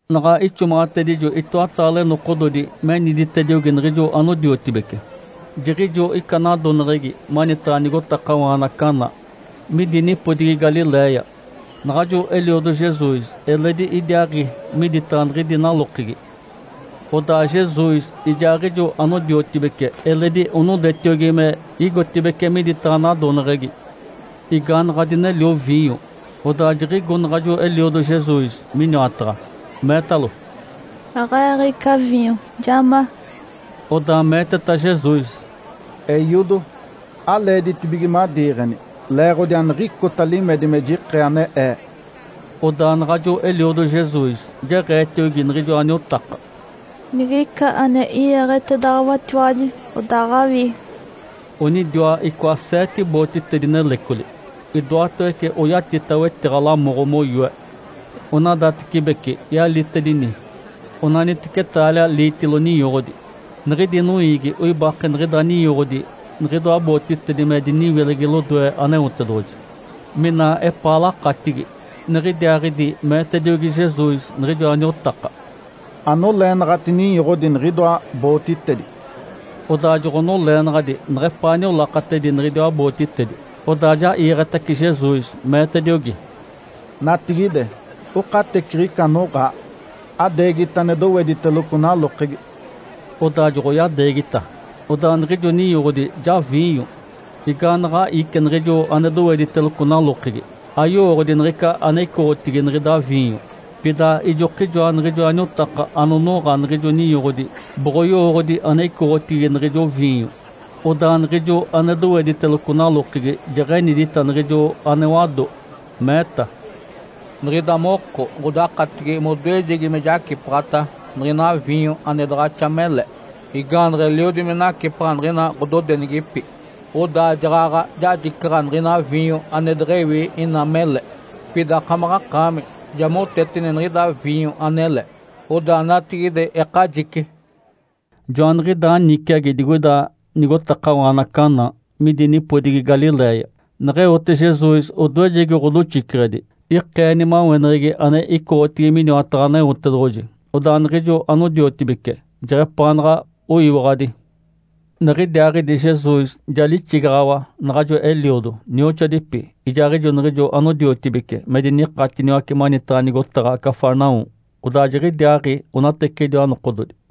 Naɡ̶a ixomaɡ̶atedijo itoataale nokododi meniditediogi niɡ̶ijo anodiotibece, jiɡ̶ijo ica nadoneɡ̶egi manitaɡ̶a nigotakawaana Caná, midi nipodigi Galiléia. Naɡ̶ajo eliodo Jesus eledi idiaaɡ̶i miditaɡ̶a niɡ̶idi nalokegi. Odaa Jesus ijaaɡ̶ijo anodiotibece eledi onodetiogi me igotibeci miditaɡ̶a nadoneɡ̶egi. Igaanaɡ̶a dinelio viinyo, odaa jiɡ̶igo naɡ̶ajo eliodo Jesus miniwataɡ̶a, meetalo, “Aɡ̶e-eeɡ̶ica viinyo, ja ma”. Odaa meeteta Jesus, “Eiodo. Aleeditibige madiiɡ̶eni. Leeɡ̶odi aniɡ̶icota limedi me jikee ane Ee”. Odaa naɡ̶ajo eliodo Jesus jeɡ̶eetiogi niɡ̶ijoa niotaka, “Nigica ane i-iiɡ̶etedaɡ̶awatiwaji, odaaɡ̶awii”. Onidiwa icoa seete bootitedi nelecoli, idoatawece oyatita wetiɡ̶a lamoɡ̶o moyoe. Onadatecibeci yalitedini onaniteci taalia liitilo ninyoɡ̶odi. Niɡ̶idi noiigi oibake niɡ̶ida ninyoɡ̶odi niɡ̶idoa bootitedi me diniwilegi lodoe Aneotedoɡ̶oji, mina epaa lakatigi. Niɡ̶idiaaɡ̶idi meetediogi Jesus niɡ̶ijoa niotaka, “Anoleenaɡ̶ati ninyoɡ̶odi niɡ̶idoa bootitedi”. Odaa joɡ̶onoleenaɡ̶adi neɡ̶epaa niolakatedi niɡ̶idiwa bootitedi. Odaa ja iiɡ̶etace Jesus, meetediogi, “Natigide okateciɡ̶ica anoɡ̶aa, adeegita ane dowediteloco nalokegi”. Odaa joɡ̶oyadeegita. Odaa niɡ̶ijo ninyoɡ̶odi ja viinyo. Igaanaɡ̶a ici niɡ̶ijo ane dowediteloco nalokegi, ayowooɡ̶odi niɡ̶ica ane icoɡ̶otigi niɡ̶ida viinyo. Pida ijokijoa niɡ̶ijoa niotaka anonoɡ̶a niɡ̶ijo ninyoɡ̶odi boɡ̶oyowooɡ̶odi ane icoɡ̶otigi niɡ̶ijo viinyo. Odaa niɡ̶ijo ane dowediteloco nalokegi jeɡ̶enidita niɡ̶ijo ane wado. Meeta, “Niɡ̶ida moko ɡ̶odakatigi modoejegi me jacipaɡ̶ata niɡ̶ina viinyo ane daɡ̶axa mele. Igaanaɡ̶a eliodi me nacipaɡ̶a niɡ̶ina ɡ̶ododenigipi, odaa jaɡ̶aɡ̶a jajicaɡ̶a niɡ̶ina viinyo ane deɡ̶ewi ina mele. Pida akamaɡ̶akaami ja moteteni niɡ̶ida viinyo anele, odaa natigide ekajici.” Joaniɡ̶idaa niciagi digoida nigotakawaana Caná, midi nipodigi Galiléia, neɡ̶eote Jesus odoejegi ɡ̶odoxiceɡ̶edi. Ikee nimaweneɡ̶egi ane icoɡ̶otigi miniwataɡ̶a Aneotedoɡ̶oji. Odaa niɡ̶ijo anodiotibece jeɡ̶epaanaɡ̶a oyiwaɡ̶adi. Niɡ̶idiaaɡ̶idi Jesus ja lixigaɡ̶awa, naɡ̶ajo eliodo, nioxoadipi, ijaaɡ̶ijo niɡ̶ijo anodiotibece me dinikatiniwace manitaɡ̶a nigotaɡ̶a Cafarnaum. Odaa jiɡ̶idiaaɡ̶i onateciɡ̶ijoa nokododi.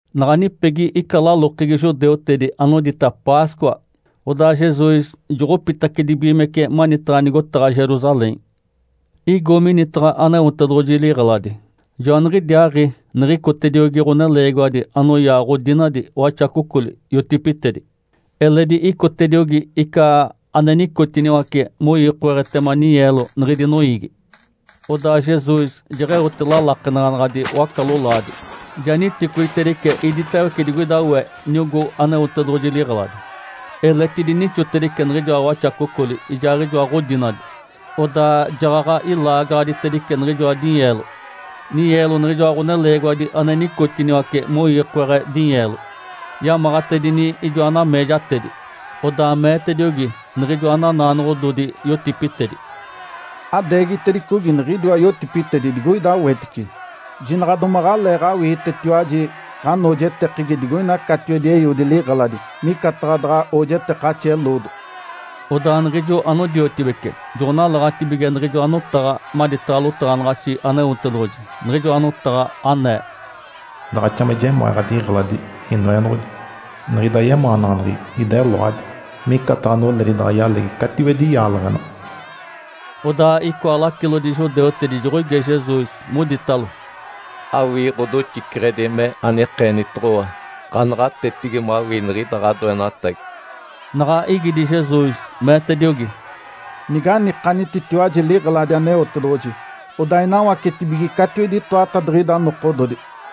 Naɡ̶a nipegi ica lalokegi judeutedi anodita Páscoa, odaa Jesus joɡ̶opitacedibigimece manitaɡ̶a nigotaɡ̶a Jerusalém. Igo minitaɡ̶a Aneotedoɡ̶oji liɡ̶eladi. Joaniɡ̶idiaaɡ̶i niɡ̶icotediogi ɡ̶oneleegiwadi anoyaa ɡ̶odinadi, waxacocoli, yotipitedi. Eledi icotediogi ica ane nicotiniwace moiikoaɡ̶etema ninyeelo niɡ̶idi noiigi. Odaa Jesus jeɡ̶eote lalakenaɡ̶anaɡ̶adi waca-lolaadi, ja niticoitedice iditawece digoida we niogó Aneotedoɡ̶oji liɡ̶eladi. Eletidi nixotedice niɡ̶ijoa waxacocoli ijaaɡ̶ijoa ɡ̶odinadi. Odaa jaɡ̶aɡ̶a ilaagaɡ̶aditedice niɡ̶ijoa dinyeelo, ninyeelo niɡ̶ijoa ɡ̶oneleegiwadi ane nicotiniwace moiikoaɡ̶e dinyeelo. Yamaɡ̶atedini ijoa nameejatedi. Odaa meetediogi niɡ̶ijoa nanaanoɡ̶ododi yotipitedi, “Adeegitedicogi niɡ̶idiwa yotipitedi digoida wetice. Jinaɡ̶a domaɡ̶aleeɡ̶awiitetiwaji ɡ̶anoojetekegi digoina catiwedi Eiodi liɡ̶eladi micataɡ̶a daɡ̶a oojetekaxi eloodo.” Odaa niɡ̶ijo anodiotibece joɡ̶onalaɡ̶atibige niɡ̶ijoa notaɡ̶a maditaɡ̶a lotaɡ̶anaɡ̶axi Aneotedoɡ̶oji, niɡ̶ijoa notaɡ̶a anee, “Daɡ̶axa me jemaa ɡ̶adiɡ̶eladi, Inoenoɡ̶odi. Niɡ̶ida yemaanaɡ̶aneɡ̶egi ideloadi, micataɡ̶a noledi daɡ̶a yalegi catiwedi yaaleɡ̶ena.” Odaa icoa lacilodi judeutedi joɡ̶oige Jesus, moditalo, “Awii ɡ̶odoxiceɡ̶edi me anikeenitoɡ̶owa ɡ̶anaɡ̶atetigi mawii niɡ̶ida ɡ̶adoenatagi?” Naɡ̶a igidi Jesus, meetediogi, “Niganikanititiwaji liɡ̶eladi Aneotedoɡ̶oji, odaa inawacetacibige catiwedi itoatadiɡ̶ida nokododi”.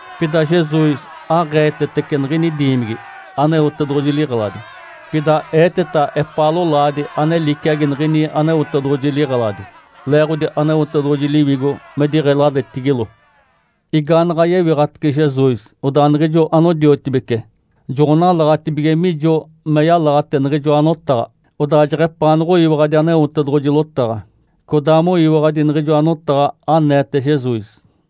Pida Jesus aɡ̶eetetece niɡ̶ini diimigi, Aneotedoɡ̶oji liɡ̶eladi. Pida eeteta epaa lolaadi ane liciagi niɡ̶ini Aneotedoɡ̶oji liɡ̶eladi. (Leeɡ̶odi Aneotedoɡ̶oji Liwigo me diɡ̶eladetigilo.) Igaanaɡ̶a yewiɡ̶atace Jesus, odaa niɡ̶ijo anodiotibece joɡ̶onalaɡ̶atibige mijo me yalaɡ̶ate niɡ̶ijoa notaɡ̶a. Odaa jeɡ̶epaanoɡ̶oyiwaɡ̶adi Aneotedoɡ̶oji lotaɡ̶a, codaa moyiwaɡ̶adi niɡ̶ijoa notaɡ̶a aneete Jesus.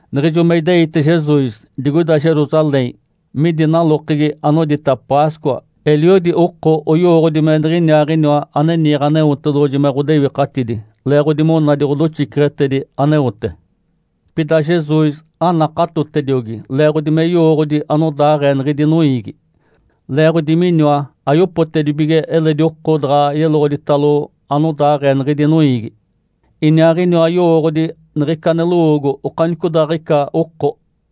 Niɡ̶ijo me ideite Jesus digoida Jerusalém midi nalokegi anodita Páscoa, eliodi oko oyowooɡ̶odi me Niɡ̶iniaaɡ̶iniwa ane niiɡ̶e Aneotedoɡ̶oji me ɡ̶odewikatidi, leeɡ̶odi monadi ɡ̶odoxiceɡ̶etedi aneote. Pida Jesus anakatotediogi, leeɡ̶odi me yowooɡ̶odi anodaaɡ̶ee niɡ̶idi noiigi. Leeɡ̶odi miniwa ayopotedibige eledi oko daɡ̶a yeloɡ̶oditalo anodaaɡ̶ee niɡ̶idi noiigi, Iniaaɡ̶iniwa yowooɡ̶odi niɡ̶ica ane lowoogo okanicodaaɡ̶ica oko.